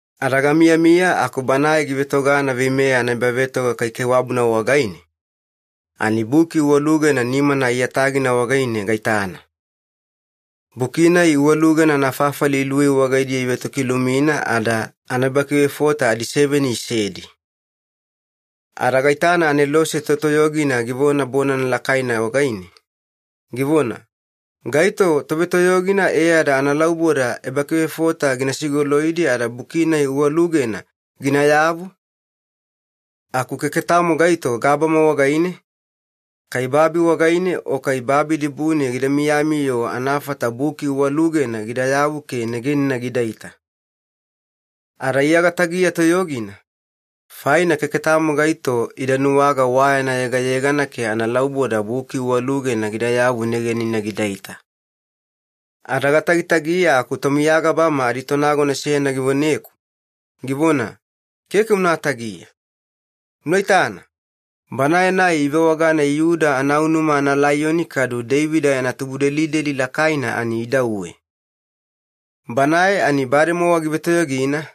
Ada gamiyamiya aku Banae givetogana veimeya anaebavetoga kaikaiwabuna wagaine, ani buki uwalugena nimana aiyatagina wagaine gaitana. Buki-nai uwalugena anafafali iluwei wagaidiya ivetokilumina ada anaebakivefota adiseveni isedi. Ada gaitana anelose totoyogina givona bonana lakaina wagaine, givona, “Gaito tovetoyogina e ada analauboda ebakivefota gina sigoloidi ada buki-nai uwalugena ginayavu?” Aku keke tamo gaito gabama wagaine, kai babi wagaine o kai babi dibune gida miyami-yo anafata buki uwalugena gidayavu ke negenina gidaita. Ada Iya gatagiya toyogina, faina keke tamo gaito ida nuwaga wa yana yegayegana ke analauboda buki uwalugena gidayavu negenina gidaita. Ada gatagitagiya aku tomiya gabama aditonagona seyana givoneku, givona, “Keke una tagiya. Una itana, Banae-nai ivewagana ‘Iyuda anaunuma analaiyoni’ kadu ‘Deivida yana tubudelideli lakaina’ ani idauwe. Banae ani bademowa givetoyogina,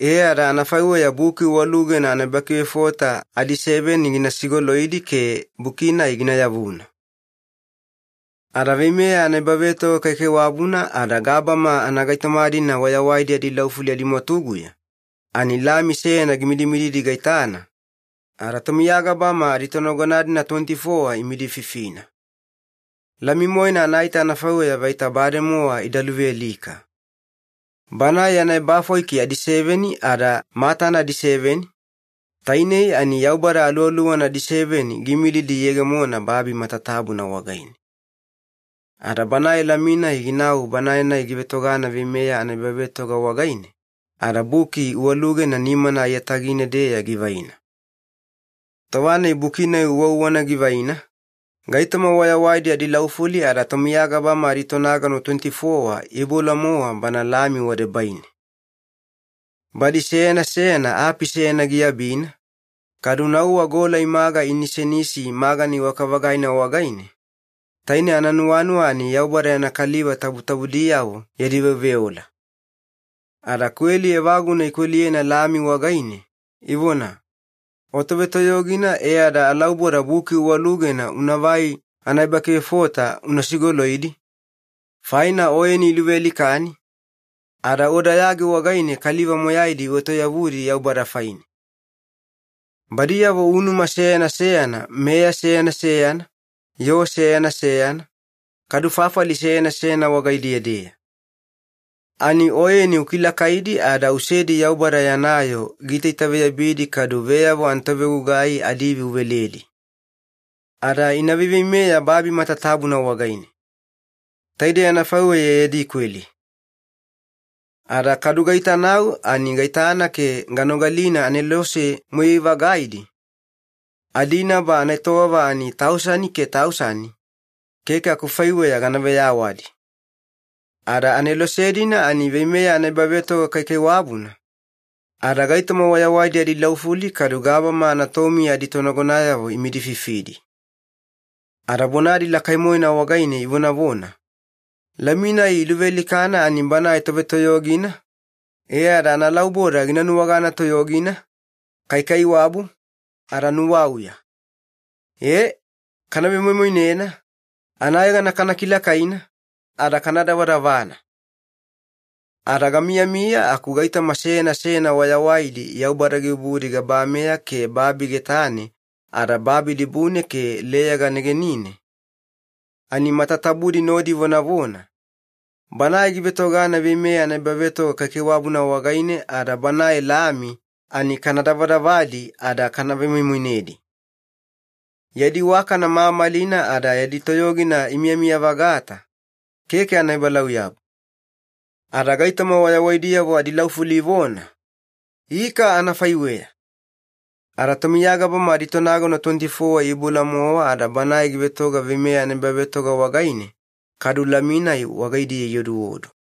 e ada anafaiweya buki uwalugena anaebakivefota adiseveni gina sigoloidi ke buki-nai gina yavuna.” Ada veimeya anaebavetoga kaikaiwabuna ada gabama anagaitoma-dina wayawaidi adilaufuli adimwatuguya, ani Lami seyana gimidimididi gaitana, ada tomiya gabama aditonagona-dina tuweniti-fowa imidififina. Lami-moena anaita anafaiweya vaita bademowa ida luvealika. Banae yana ebafwaiki adiseveni ada matana adiseveni, tainei ani Yaubada Aluwaluwana adiseveni giimilidi iyegemona babi matatabuna wagaine. Ada Banae Lami-nai ginau Banae-nai givetogana veimeya anaebavetoga wagaine, ada buki uwalugena nimana aiyatagine-deya givaina. Tova-nai buki-nai uwauwana givaina, gaitoma wayawaidi adilaufuli ada tomiya gabama aditonagona tuweniti-fowa iiboula-mowa Bana Lami wadebaine. Badi seyana seyana api seyana giabina, kadu nauwa gola imaga inisenisi magana iwaka-vagaina wagaine, taine ananuwanuwa ani Yaubada yana kaliva tabutabudiyavo yadi veoveola. Ada kweli evaguna ikweliyena Lami wagaine, ivona, “O Tovetoyogina e ada alauboda buki uwalugena unavai anaebakivefota una sigoloidi, faina Oyeni iluvealikani, ada O dayagi wagaine kaliva moyaidi uetoyavudi Yaubada faine. Badiyavo unuma seyana seyana, meya seyana seyana, yoo seyana seyana, kadu fafali seyana seyana wagaidiya-deya. Ani Oyeni ukilakaidi ada usedi Yaubada yana yoo giitaitaveyabidi kadu veyavo anatovegugai adiivi uveledi. Ada ina veiveimeya babi matatabuna wagaine.” Taidei anafaiweya yadi kweli. Ada kadu gaitanau ani gaitana ke ganogalina anelose moyai-vagaidi, adinaba anaetowava ani tausani ke tausani, keke akufaiweya gana veyawadi. Ada anelose-dina ani veimeya anaebavetoga kaikaiwabuna ada gaitoma wayawaidi adilaufuli kadu gabama anatomiya aditonagonayavo imidififidi. Ada bonadi lakai-moena wagaine ivonavona, “Lami-nai iluvealikana ani Banae Tovetoyogina, e ada analauboda gina nuwagana toyogina, kaikaiwabu, ada nuwauya. Ee, kana vemoimoinena, anayegana kana kilakaina, ada kana davadavana!” Ada gamiyamiya aku gaitoma seyana seyana wayawaidi Yaubada gibubudi gabameya ke babi getane ada babi dibune ke leyaga negenine, ani matatabudi nodi ivonavona, “Banae givetogana veimeya anaebavetoga kaikaiwabuna wagaine ada Banae Lami, ani kana davadavadi ada kana vemoimoinedi. Yadi iwakana mamalina ada yadi toyogina imiyamiya-vagata, keke anaebalauyabu!” Ada gaitoma wayawaidiyavo adilaufuli ivona, “Ika anafaiweya!” Ada tomiya gabama aditonagona tuweniti-fowa iiboula-mowa ada Banae givetoga veimeya anaebavetoga wagaine, kadu Lami-nai wagaidiya ioduodu.